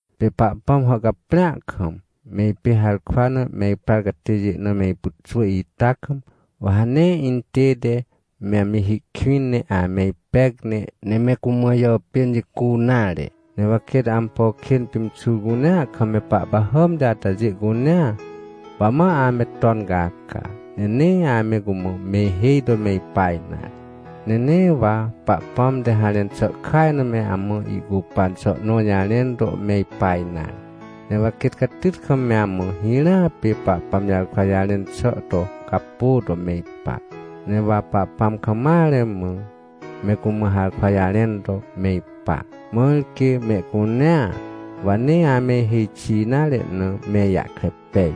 Pê Pahpãm hàhcaprĩa kam, me ipê harkwa na me iprar catêjê na me ipyxwỳ ita kam, wa ha nee intête me amji hi kwĩn, ne ame ipec, ne me cumã ijàpên jicu nare. Ne wa quêt ampo kên pimxur cunea kam me pahpahàmti atajê cunea, wa ma ame ton caca, ne nee ame cumã me ihêj to me ipa nare. Ne nee wa Pahpãm te harẽn xà kaj na me amã ihcupan xà nõ jarẽn to me ipa nare. Ne wa quêt catyt kam me amã hirãa pê Pahpãm jarkwa jarẽn xà to capô to me ipa. Ne wa Pahpãm kam mare mã, me cumã harkwa jarẽn to me ipa, mãr quê mehcunea, wa nee ame ihêj xi nare na, me ijahkre pej.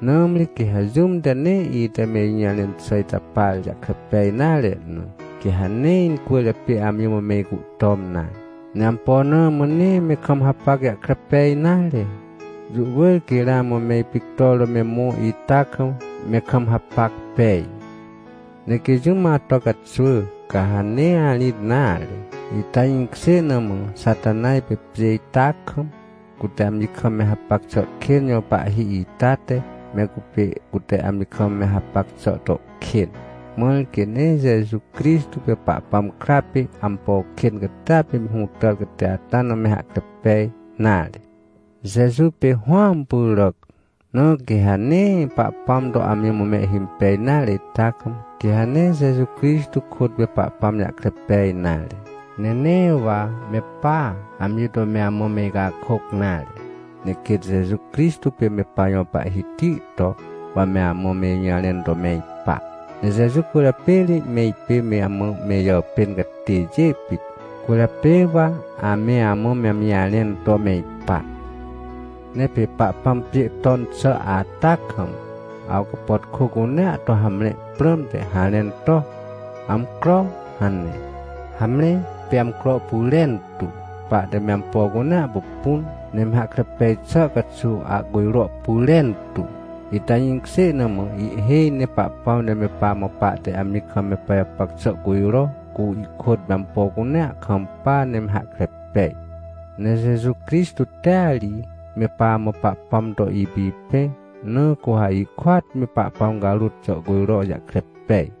Nãmri quê ha jũm te nee ite me ijũjarẽn xà ita par jahkre pej nare na, quê ha nee incwỳrjapê amji mã me icuhtom nare. Ne ampo na mã nee me kam hapac jahkre pej nare? Jũ wỳr quê ramã me ipictor to me mõ ita kam me kam hapac pej. Ne quê jũm ato caxwỳ, ca ha nee arĩt nare. Ita jĩkjê na mã Xatanaj pê pjê ita kam, cute amji kam me hapac xà kên jõ pahhi ita te, me cupê cute amji kam me hapac xà to kên, mãr quê nee Jeju Crixtô pê Pahpãm kra pê ampo kên catia pê me hũtàr catê ata na me hahkre pej nare. Jeju pê Hũam pyràc, na quê ha nee Pahpãm to amji mã mehhimpej nare ita kam, quê ha nee Jeju Crixtô kôt me Pahpãm jahkre pej nare. Ne nee wa me pa, amji to me amã me icakôc nare, ne quêt Jeju Crixtô pê me pajõ Pahhiti to, wa me amã me ijũjarẽn to me ipa. Ne Jeju cwỳrjapê ri me ipê me amã me ijàpên catêjê pit. Cwỳrjapê wa ame amã me amji jarẽn to me ipa. Ne pê Pahpãm pjê ton xà ata kam, awcapàtkô cunea to hamre prãmte, harẽn to: “Amcro” hane. Hamre pê amcro pyrentu, pahte me ampo cunea pupun, ne me hahkre pej xà caxuw ahcujro pyrentu. Ita jĩkjê na mã, ihhêj ne Pahpãm te me pamã pahte amji kam me pajapac xà cujro, cu ihkôt me ampo cunea kampa, ne me hahkre pej. Ne Jeju Crixtô tea ri me pamã Pahpãm to ipipẽ, na cu ha ihkôat me Pahpãm carôt jàhcujro jahkre pej.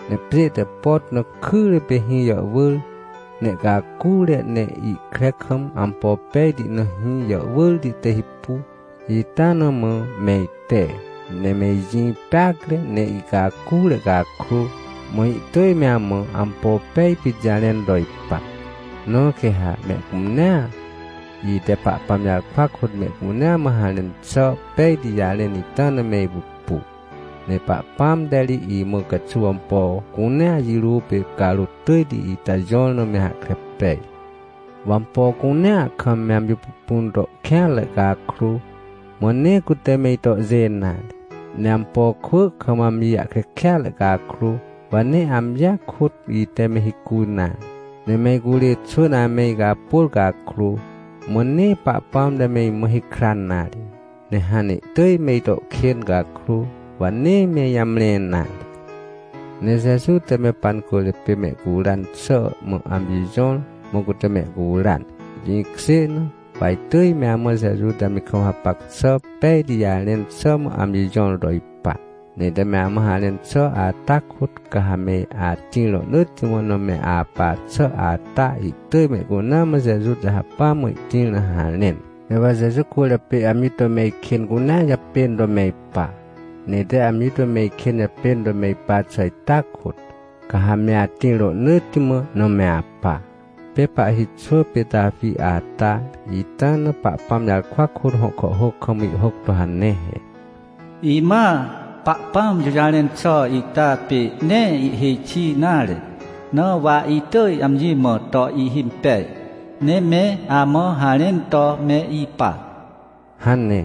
Ne pjê te pot na kyre pê hĩ jàhwỳr, ne ihcacure, ne ihkre kam, ampo pejti na hĩ jàhwỳrti te hipu, ita na mã me ite. Ne me ijĩ peacre, ne ihcacure cakrô, mã ihtỳj me amã ampo pej pit jarẽn to ipa. Na quê ha mehcunea, ite Pahpãm jarkwa kôt mehcunea mã harẽn xà pejti jarẽn ita na me ipupu. Ne Pahpãm te ri imã caxuw ampo cunea jirô pê carôt tỳjti ita jõr na me hahkre pej. Wa ampo cunea kam me amji pupun to kêanre cakrô, mã nee cute me itohjê nare. Ne ampo kwỳ kam amji jahkre kêatre cakrô, wa nee amjia kôt ite me hicu nare. Ne me icurê xwỳn ame icapôr cakrô, mã nee Pahpãm te me imã hikran nare. Ne hãn ne ihtỳj me ito kên cakrô, wa nee me ijamre nare. Ne Jeju te me pancwỳrjapê mehcuran xà mã amji jõr, mã cute mehcuran. Jĩkjê na, wa itỳj me amã Jeju te amji kam hapac xà pejti jarẽn xà mã amji jõr to ipa. Ne ite me amã harẽn xà ata kôt, ca ha me atĩr rohnỳtti mã na me apa xà ata, ihtỳj mehcunea mã Jeju te hacpỹa mã ihtĩr na harẽn. Ne wa Jeju cwỳrjapê amji to me ikên cunea japên to me ipa. Ne ite amji to me ikên japên to me ipa xà ita kôt, ca ha me atĩr rohnỳtti mã na me apa. Pê pahhi xwỳ pê Tawi ata, ita na Pahpãm jarkwa kôt hõ kàhhôc kam ihhôc to hane he: “Imãa, Pahpãm jũjarẽn xà ita pê nee ihhêj xi nare, na wa itỳj amji mã to ihimpej, ne me amã harẽn to me ipa” hane.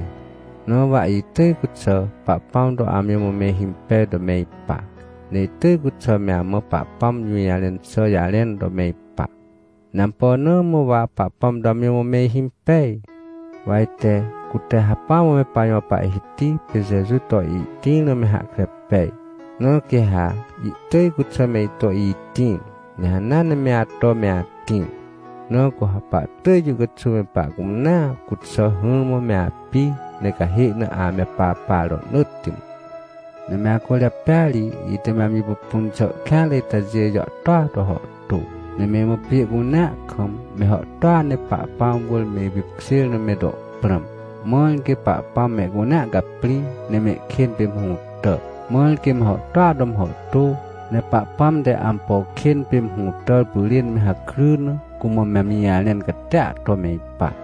Na wa itỳj cuxà Pahpãm to amji mã me ihimpej to me ipa, ne itỳj cuxà me amã Pahpãm jũjarẽn xà jarẽn to me ipa. Ne ampo na mã wa Pahpãm to amji mã me ihimpej? Wa ite, cute hacpỹa mã me pajõ Pahhiti pê Jeju to ihtĩr na me hahkre pej, na quê ha ihtỳj cuxà me ito itĩr, ne hanea ne me ato me atĩr. Na cu ha pahtỳj jũ caxuw me pahcunea cuxà hỹrmã me api, ne cahê na ame papa rohnỳtti mã. Ne me acwỳrjapêa ri, ite me amji pupun xà kêanre itajê jàhtôa to hàhtô. Ne me imã pjê cunea kam, me hàhtôa ne Pahpãm wỳr me ipipkjêr na me to prãm, mãr quê Pahpãm mehcunea caprĩ, ne mehkên pê me hũtà. Mãr quê me hàhtôa to me hàhtô, ne Pahpãm te ampo kên pê me hũtàr pyrên me hakry na, cumã me amji jarẽn catia to me ipa.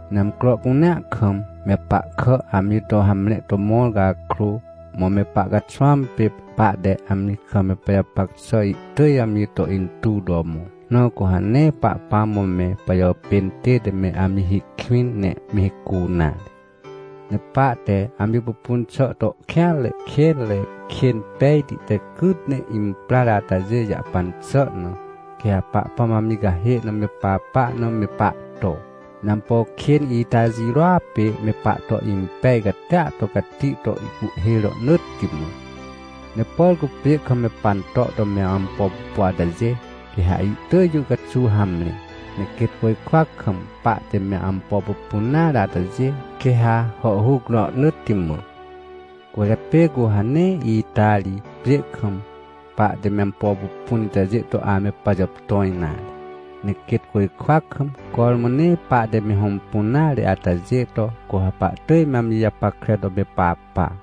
Ne amcro cunea kam, me pahkà amji to hamre to mõr cakrô, mã me pahcaxwãm pê pahte amji kam me pajapac xà ihtỳj amji to intuw to mõ. Na cu ha nee Pahpãm mã me pajàpên tête me amji hi kwĩn, ne me hicu nare. Ne pahte amji pupun xà to kêanre kênre, kên pejti te cyt ne imprar atajê jahpan xà na, quê ha Pahpãm amji cahê na me papa na me pahto, ne ampo kên ita jirôa pê me pahto impej catia to cati to ihcuhhê rohnỳtti mã. Ne por cu pjê kam me panto to me ampo pupu atajê, quê ha ihtỳj jũ caxuw hamre. Ne quêt côjkwa kam pahte me ampo pupun nare atajê, quê ha hàhhuc rohnỳtti mã. Cwỳrjapê cu ha nee ita ri, pjê kam, pahte me ampo pupun itajê to ame pajàptõ nare. Ne quêt côjkwa kam, cormã nee pahte me hõmpun nare atajê to, cu ha pahtỳj me amji japackre to me papa.